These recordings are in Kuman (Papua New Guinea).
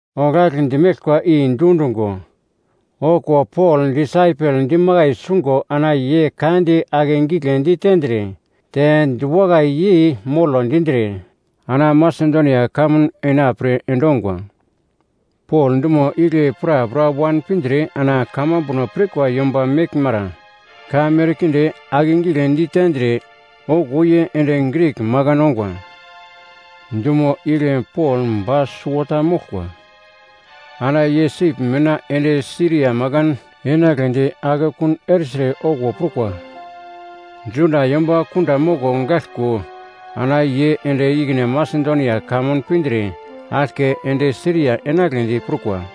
Oglagl dimeglkwa i dundungo, okuwo Pol disaipel dimakai sungo ana ye ka di ake gigle ditendre te diwakai yei molo dindre ana Masedonia kamun enapre endongwa. Pol dumo igle prapra wan pindre ana kamambuno pirkwa yomba meglmara ka merkinde akegigle ditendre okuwo ye ende Grik makan ongwa. Dumo igle Pol ba suwota moglkwa. Ana ye sip mina ende Siria makan enagledi akekun ertre okuwo prukwa, Juda yomba kunda moko gaglko ana ye ende ikine Masedonia kamun pindre aglke ende Siria enagledi prukwa.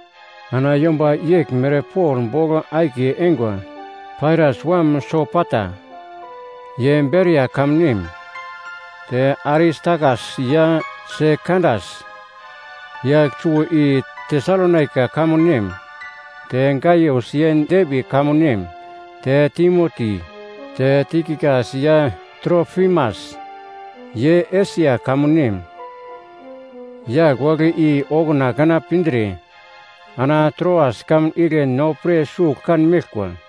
Ana yomba yeglmere Pol bogl akiye eingwa: Pairas wam Sopata, ye Beria kamun nem; te Aristakas ya Sekandas, yagl suwo i Tesalonaika kamun nem; te Gaius ye Derbi kamun nem; te Timoti, te Tikikas ya Trofimas, ye Esia kamun nem. Yagl wagle i okuna kana pindre ana Troas kamun igle no pre sugl kan meglkwa.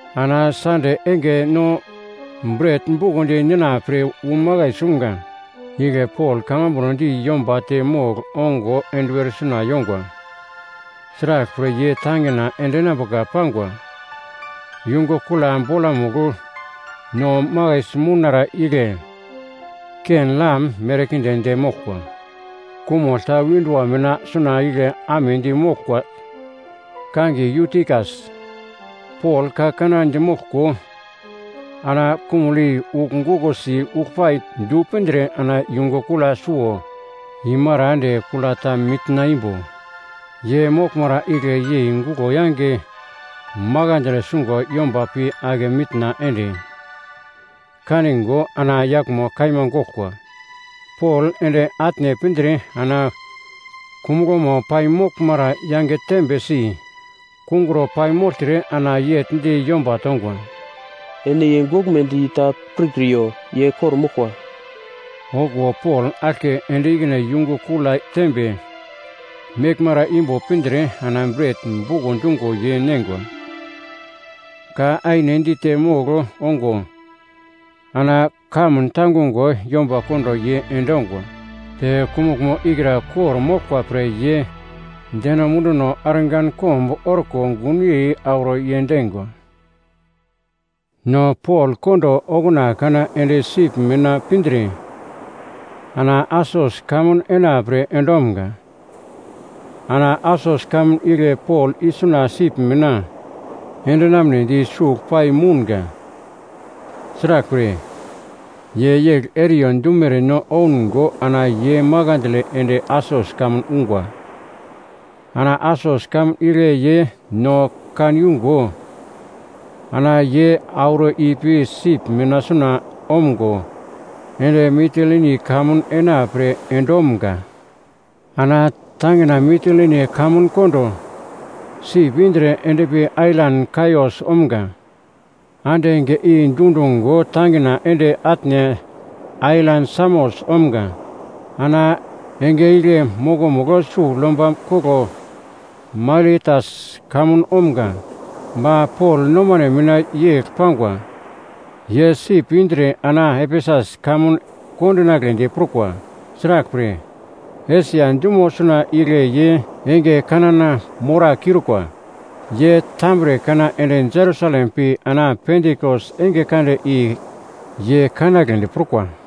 Ana Sande enge no bret bukondi nina pre wu makai sumga. Igle Pol kamambuno di yomba te mogl ongo enduwer suna yongwa. Sraglpre ye tangina endinambuka pangwa. Yungu kula bolamugl no makaisi mounara igle ken-lam merkinde de moglkwa. Kumugl ta windua mina suna igle amedi moglkwa kangiye Yutikas. Pol ka kanana dimoglko, ana kumugl i ugl gukosi uglpai du pindre ana yungu kula suwo imara ende kula ta mitna imbo ye moglmara igle yei guglo yange makandle sungo yomba pi ake mitna ende kaningo ana yaglmo kaima goglkwa. Pol ende atne pindre ana kumuglmo paimoglmara yange tembe si kungro paimogltre ana yegl di yomba tongwa, “Ene ye goglmedi ta pirkriyo. Ye kor-moglkwa.” Okuwo Pol aglke ende ikine yungu kula tembe meglmara imbo pindre ana bret buko dungo ye neingwa. Ka aine dite mogl ongo ana kamun tangungo yomba kondo ye endongwa. Te kumuglmo ikra kor-moglkwa pre ye deno munduno argankomb orko gunyei auro yendingwa. No Pol kondo okuna kana ende sip mina pindre ana Asos kamun enapre endomga. Ana Asos kamun igle Pol isuna sip mina endinamnedi sugl pai mounga. Sraglpre, ye yegl eriyo dumere no oungo ana ye makandle ende Asos kamun ungwa. Ana Asos kamun igle ye no kan yungo ana ye auro ipi sip mina suna omgo ende Mitilini kamun ena pre endomga. Ana tangina Mitilini kamun kondo sip indre endpi ailan Kaios omga. Ande enge i dundungo tangina ende atne ailan Samos omga. Ana enge igle mokomugl sugl yomba koglo Mailetas kamun omga. Ba Pol nomane mina yegl pangwa, ye sip indre ana Efesus kamun kondinagledi prukwa. Sraglpre, Esia dumo suna igle ye enge kanana morakiurukwa. Ye tambre kana ende Jerusalem pi ana Pentikos enge kande i ye kanagledi prukwa.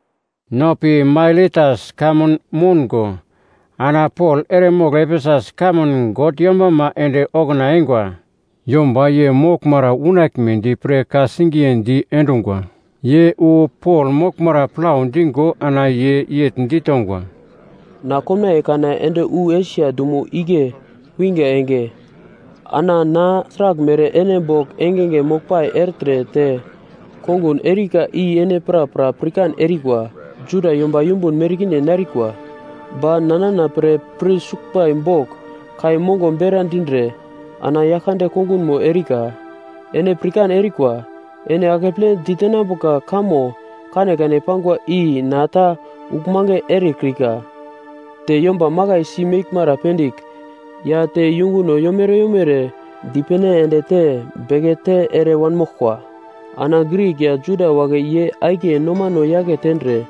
No pi Mailetas kamun moungo ana Pol eremogl Efesus kamun God yombama ende okuna eingwa yomba ye moglmara unaglmedi pre ka-singiye diendungwa. Ye wu Pol moglmara plau dingo ana ye yegl ditongwa, “Na komnaiye kana ende wu Esia dumo igle winga enge, ana na sraglmere ene bogl engenge moglpai ertre te kongun erika i ene prapra pirkan erikwa. Juda yomba yumbun merkinde narikwa, ba na nana pre pir suglbai bogl kai mongo bera dindre ana Yaglkande kongunmo erika. Ene pirkan erikwa, ene akeple ditenambuka kamo kanekane pangwa i na ta uglmange erekrika, te yomba makaisi meglmara pendigl ya te yunguno yomere yomere dipene ende te bekete ere wanmoglkwa. Ana Grik ya Juda wagle ye akiye nomano yake tendre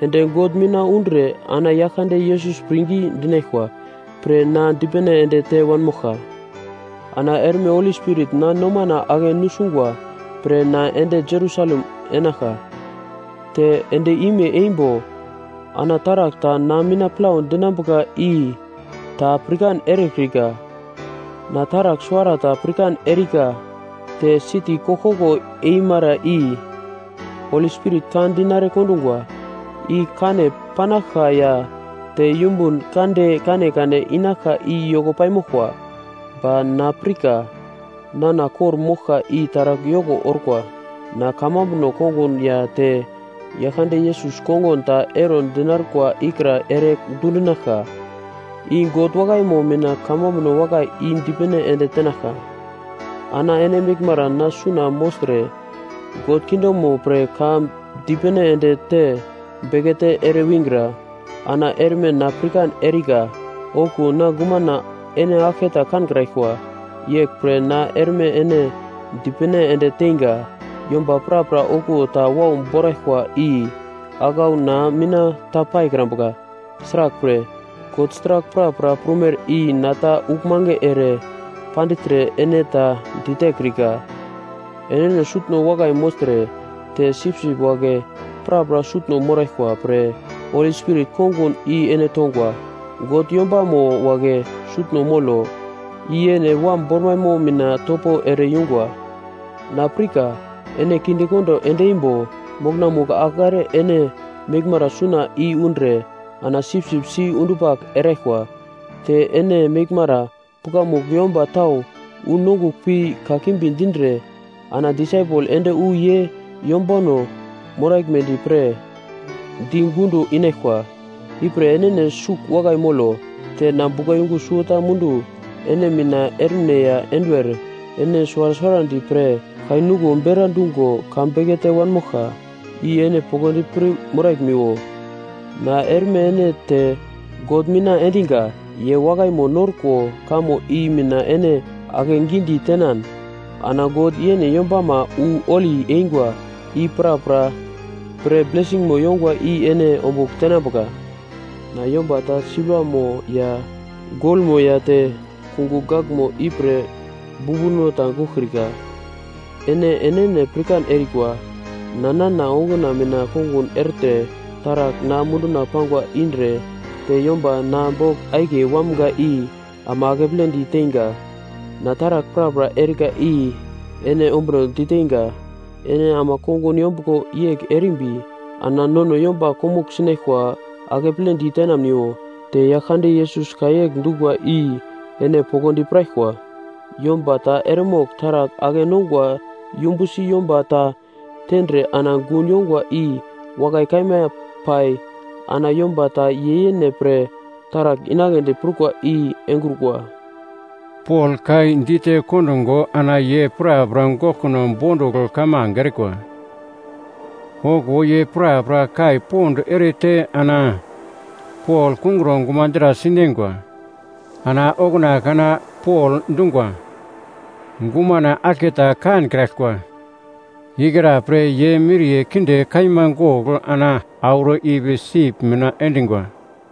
ende God mina undre ana Yaglkande Yesus pirngi dinaglkwa pre na dipene ende te wanmoglka. “Ana erme Holi Spirit na nomana ake nusungwa pre na ende Jerusalem enaglka, te end-ime eimbo ana taragl ta na mina plau dinambuka i ta pirkan erekrika. Na taragl suwarata pirkan erika, te siti koglkoglo eimara i Holi Spirit ka dinare kondungwa, i kane panaglka ya te yumbun kande kanekane inaglka i yoko paimoglkwa. Ba na pirka nana kor-moglka i taragl yoko orkwa, na kamambuno kongun ya te Yaglkande Yesus kongun ta ero dinarkwa ikra ere dundinaglka, i God wakaimo mina kamambuno wakai i dipene ende tenaglka. “Ana ene meglmara na suna mogltre God kingdomo pre ka dipene ende te bekete ere wingra. Ana erme na pirkan erika, okuwo na gumana ene aglketa kankraglkwa. Yeglpre na erme ene dipene ende teinga, yomba prapra okuwo ta wau boraglkwa i aglauno na mina ta paikrambuka. Sraglpre, God sragl prapra prumere i na ta uglmange ere pandigltre ene ta ditekrika. Enene sutno wakai mogltre, te sipsip wagle prapra sutno moraglkwa pre Holi Spirit kongun i ene tongwa, God yombamo wagle sutno molo, i yene Wam bormaimo mina topo ere yungwa. Na pirka, ene kindekondo ende imbo mokonamugl agl are ene meglmara suna i undre ana sipsip si-undupagl eraglkwa. Te ene meglmara pukamugl yomba tau wu nongugl pi kakimbi dindre, ana disaipel ende wu ye yombano moraglmedi pre di gundo inaglkwa. Ipre enene sugl wakai molo, te na buglayungu suwota mundu ene mina ermine ya enduwer ene suwara suwarandi pre, kai nuglo bera dungo ka bekete wanmoglka, i ene poglodi pir moraglmiwo. “Na erme ene te God mina endinga, ye wakaimo norkwa kamo i mina ene akegidi tenan ana God yene yombama wu holi eingwa i prapra pre blesingmo yongwa i ene ombugl tenambuka. Na yomba ta silvamo ya golmo ya te kungugl gaglmo ipre bumbuno ta goglkrika. Ene enene pirkan erikwa, na nana onguna mina kongun ertre taragl na munduna pangwa indre te yomba na bogl akiye wamga i ama akepledi teinga. Na taragl prapra erika i ene ombunodi teinga, ene ama kongun yombuglo yegl erimbi ana nono yomba komugl sinaglkwa akeple ditenamuniwo, te Yaglkande Yesus ka yegl dungwa i ene poglodi piraglkwa, ‘Yomba ta eremogl taragl ake-nongwa yumbusi yomba ta tendre ana gun yongwa i wakai kaima pai ana yomba ta ye yene pre taragl inagledi prukwa i engrukwa.’” Pol ka i dite kondungo ana ye prapra goglkuno bondugl kamange erikwa. Okuwo ye prapra kai pond erete ana Pol kungro gumadra sineingwa. Ana okuna kana Pol dungwa, “Gumana aglketa kankraglkwa!” Ikra pre ye miriye kinde kaima gogl ana auro ipi sip mina endingwa.